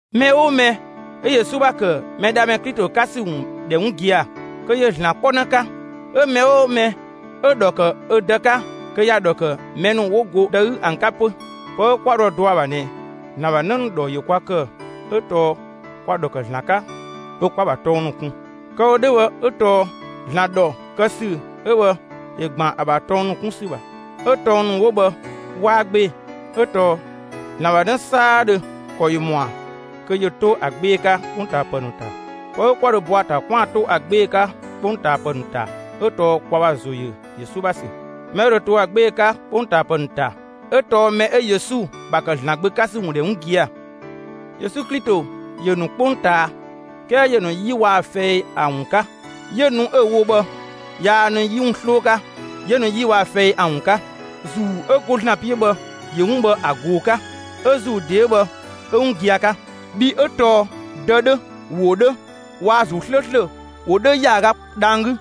Mɛ 'oo mɛ 'ö Yesu ‑bha ‑kë Mɛdhamɛ Klito 'ka ‑sü ‑wun ‑dhɛ 'wun gia‑, kö ‑yö ‑Zlan 'kpɔnë 'ka. 'Ö mɛ 'oo mɛ 'ö‑ ‑dhɔ ‑kë ö Dë 'ka kö ‑ya ‑dhɔ ‑kë mɛ ‑nu 'wo go Dë 'gü ‑an 'ka 'pö. Pë 'ö 'kwa dho ‑a dɔ ‑a ‑bha ꞊nɛ ‑Zlan ‑bha 'në ‑nu ‑dhɔ ‑yö kwa ‑kë 'ö tɔɔ kwa‑ ‑dhɔ ‑kë ‑Zlan 'ka 'ö 'kwa‑ ‑bha tɔng ‑nu kun. Kë‑ wo 'dhö bhë 'ö tɔɔ ‑Zlan ‑dhɔ kë ‑sü 'ö bhë, ‑yö ‑gban ‑a ‑bha tɔng ‑nu 'kun ‑sü ‑bha, 'ö tɔng ‑nu 'wo bhë 'waa 'gbee‑. 'Ö tɔɔ ‑Zlan ‑bha 'në 'saadhö ‑kɔ ‑yö ‑mɔa kö ‑yö 'to ‑a 'gbee‑ 'ka 'kpongtaapë ‑nu ‑ta. Pë 'ö 'kwa dho bɔ ‑a ‑ta 'kwaan‑ 'to ‑a 'gbee‑ 'ka 'kpongtaapë ‑nu ‑ta 'ö tɔɔ kwa ‑bha ‑zo ‑yö Yesu ‑bha ‑sü. Mɛ 'ö dho to ‑a 'gbee‑ 'ka 'kpongtaapë ‑nu ‑ta 'ö tɔɔ mɛ 'ö Yesu ‑bha ‑kë ‑Zlan Gbö 'ka ‑sü ‑wun ‑dhɛ 'wun gia‑. Yesu Klito ‑yö ‑nu 'kpongtaa; 'kɛɛ ‑yö ‑nu 'yi waa‑ fɛi ‑an ‑wun 'ka. 'Yö nu 'ö‑ wo 'dhö bhë, yaa nu 'yi ‑wun 'sloo 'ka, ‑yö ‑nu 'yi waa‑ fɛi ‑an ‑wun 'ka. ‑Zuu 'ö go ‑Zlan 'piö bhë ‑yö 'wun bhë ‑a ꞊goo‑ 'ka; 'ö ‑Zuu ‑de 'ö bhë, 'ö 'wun gia‑ 'ka. Bhii 'ö tɔɔ Dë 'dhö, ‑wo 'dhö waa‑ ‑Zuu 'slööslö ‑wo 'dhö ‑yaaga dhang‑ 'gü,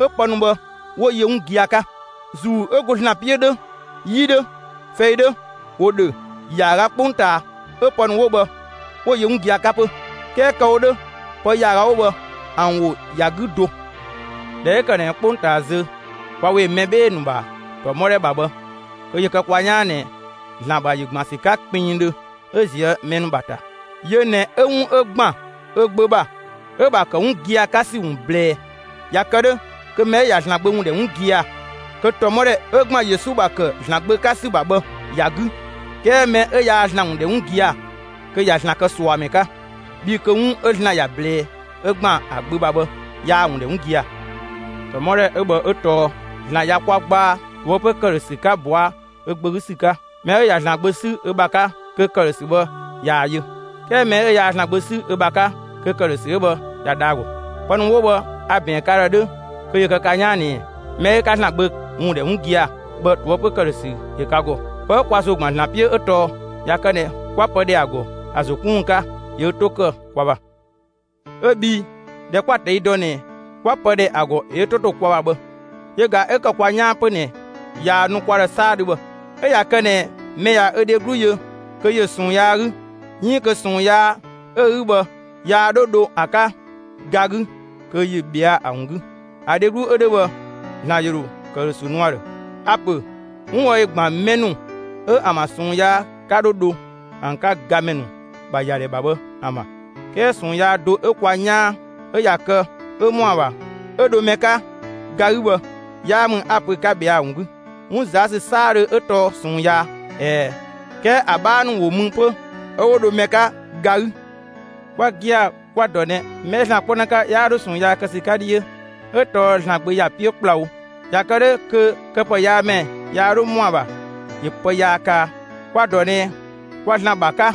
'ö pë ‑nu bhë 'wo‑ yö 'wun gia‑ 'ka. ‑Zuu 'ö go ‑Zlan 'piö 'dhö, 'yi 'dhö, fɛi 'dhö, ‑wo ‑dhö ‑yaaga 'kpongtaa 'ö pë ‑nu 'wo bhë 'wo‑ yö 'wun gia‑ 'ka 'pö. 'Kɛɛ kë‑ wo 'dhö pë ‑yaaga 'wo bhë, ‑an ‑wo ‑ya 'gü do. ꞊Dhɛ 'ö ‑kë ꞊nɛ 'kpongtaa zö kwa ‑we mɛ 'bhee‑ ‑nu ‑bha ‑tɔmɔdhɛ ‑bha bhë kö ‑yö kë kwa 'yaan ꞊nɛ ‑Zlan ‑bha ‑yö ‑gban ‑sü 'ka kpinngdhö 'ö ꞊zië' mɛ ‑nu ‑bha ‑ta. Yö ꞊nɛ 'ö 'wun 'ö ‑gban ö Gbö ‑bha 'ö‑ ‑bha ‑kë 'wun gia‑ 'ka ‑sü ‑wun ꞊blɛɛ. ꞊Ya kë 'dhö kö mɛ 'ö ꞊ya ‑Zlan Gbö ‑wun ‑dhɛ 'wun gia‑, kö ‑tɔmɔdhɛ 'ö ‑gban Yesu ‑bha ‑kë ‑Zlan Gbö 'ka ‑sü ‑bha bhë ‑ya 'gü. 'Kɛɛ mɛ 'ö 'yaa ‑Zlan ‑wun ‑dhɛ 'wun gia‑, kö ꞊ya ‑Zlan kë ꞊suamɛ 'ka, bhii kö 'wun 'ö ‑Zlan ‑ya ꞊blɛɛ 'ö ‑gban ‑a Gbö ‑bha bhë yaa‑ ‑wun ‑dhɛ 'wun gia‑. ‑Tɔmɔdhɛ 'ö bhë 'ö tɔɔ: ‑Zlan ꞊ya kwa gbaa ꞊toëpö ‑këdhösü 'ka bɔa ö Gbö 'gü ‑sü 'ka. Mɛ 'ö ꞊ya ‑Zlan Gbö 'sü ö ‑bha 'ka kö ‑këdhösü bhë ꞊yaa‑ yö. 'Kɛɛ mɛ 'ö yaa ‑Zlan Gbö 'sü ö ‑bha 'ka, kö ‑këdhösü 'ö bhë ꞊ya dha ‑a ‑gɔ. Pë ‑nu 'wo bhë a‑ ‑bɛɛn ka ‑dhë 'dhö kö ‑yö kë ka 'yaan ꞊nɛ mɛ 'ö 'ka ‑Zlan Gbö ‑wun ‑dhɛ 'wun gia‑ bhë, ꞊toëpö ‑këdhösü ‑yö ka ‑gɔ. Pë 'ö kwa ‑zo ‑gban ‑Zlan 'piö 'ö tɔɔ ꞊ya kë ꞊nɛ 'kwa pë ‑dhɛ ‑a ‑gɔ ‑a ‑zo 'kun ‑wun 'ka ‑yö ö 'to ‑kë kwa ‑bha. 'Ö bhii ꞊dhɛ 'kwa‑ ꞊tɛi' dɔ ꞊nɛ 'kwa pë ‑dhɛ ‑a ‑gɔ ‑yö ö 'to ‑to kwa ‑bha bhë yö ‑ga 'ö ‑kë kwa 'yaan 'pö ꞊nɛ ꞊yaa‑ nu kwa ‑dhë 'saadhö bhë. 'Ö ꞊ya kë ꞊nɛ mɛ ꞊ya ö dheglu yö kö ‑yö ꞊sɔɔn yaa 'gü, 'iin kö ꞊sɔɔn yaa 'ö‑ 'gü bhë, yaa 'dho dho ‑a 'ka ga 'gü, kö ‑yö ꞊bhɛa' ‑a ‑wun 'gü; ‑a dheglu 'ö 'dhö bhë, ‑Zlan ‑yö ‑dho ‑këdhösü nu ‑a ‑dhë. A‑ ‑pö 'wun bhë ‑yö ‑gban mɛ ‑nu 'ö ‑an ‑bha ꞊sɔɔn yaa 'ka 'dho dho ‑an 'ka gamɛ ‑nu ‑bha ‑yadhɛ ‑bha bhë ‑an ‑bha. 'Kɛɛ ꞊sɔɔn yaa do 'ö kwa 'yaan 'ö ꞊ya kë 'ö ‑mɔ ‑a ‑bha 'ö dho mɛ 'ka ga 'gü bhë 'yaa ‑mü 'a‑ pö 'ka ꞊bhɛa' ‑a ‑wun 'gü. 'Wun ꞊zaa' ‑sü 'saadhö 'ö tɔɔ ꞊sɔɔn yaa. ꞊Ɛɛ, 'kɛɛ ‑a 'bhaa ‑nu ‑wo mü 'pö 'ö 'wo dho mɛ 'ka ga 'gü. Kwa gia‑ kwa‑ ‑dɔ ꞊nɛ mɛ 'ö ‑Zlan 'kpɔnë 'ka 'yaa 'dho ꞊sɔɔn yaa kë ‑sü 'ka 'dhiö, 'ö tɔɔ ‑Zlan Gbö ‑ya 'piö ‑kplawo. ꞊Ya kë 'dhö kö këpëyaamɛ yaa 'dhö ‑mɔa ‑bha ‑yö pë yaa kaa. Kwa‑ ‑dɔ ꞊nɛ kwa ‑Zlan ‑bha 'ka,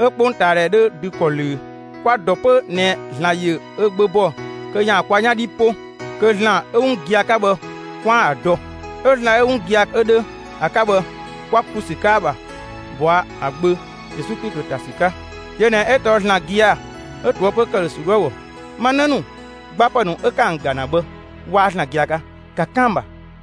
'ö 'kpongtaadhɛ 'dhö dü ‑kɔ ꞊löö. Kwa‑ ‑dɔ 'pö ꞊nɛ ‑Zlan ‑yö ö Gbö bɔ kö ‑yaan kwa 'yan 'dhi 'po, kö ‑Zlan 'ö 'wun gia‑ 'ka bhë, 'kwaan‑ ‑a dɔ. 'Ö ‑Zlan 'ö 'wun gia‑ 'ö 'dhö ‑a 'ka bhë 'kwa ‑klu ‑sü 'ka ‑a ‑bha ꞊bɔa' ‑a Gbö Yesu Klito ‑ta ‑sü 'ka. Yö ꞊nɛ 'ö tɔɔ ‑Zlan gia‑ 'ö ꞊toëpö ‑këdhösü 'dhö ‑a ‑gɔ. Ma 'në ‑nu, gbapë ‑nu ('ö 'ka ‑an ‑ga ‑na bhë, 'waa ‑Zlan gia‑ 'ka), ‑ka 'kan ‑an ‑bha!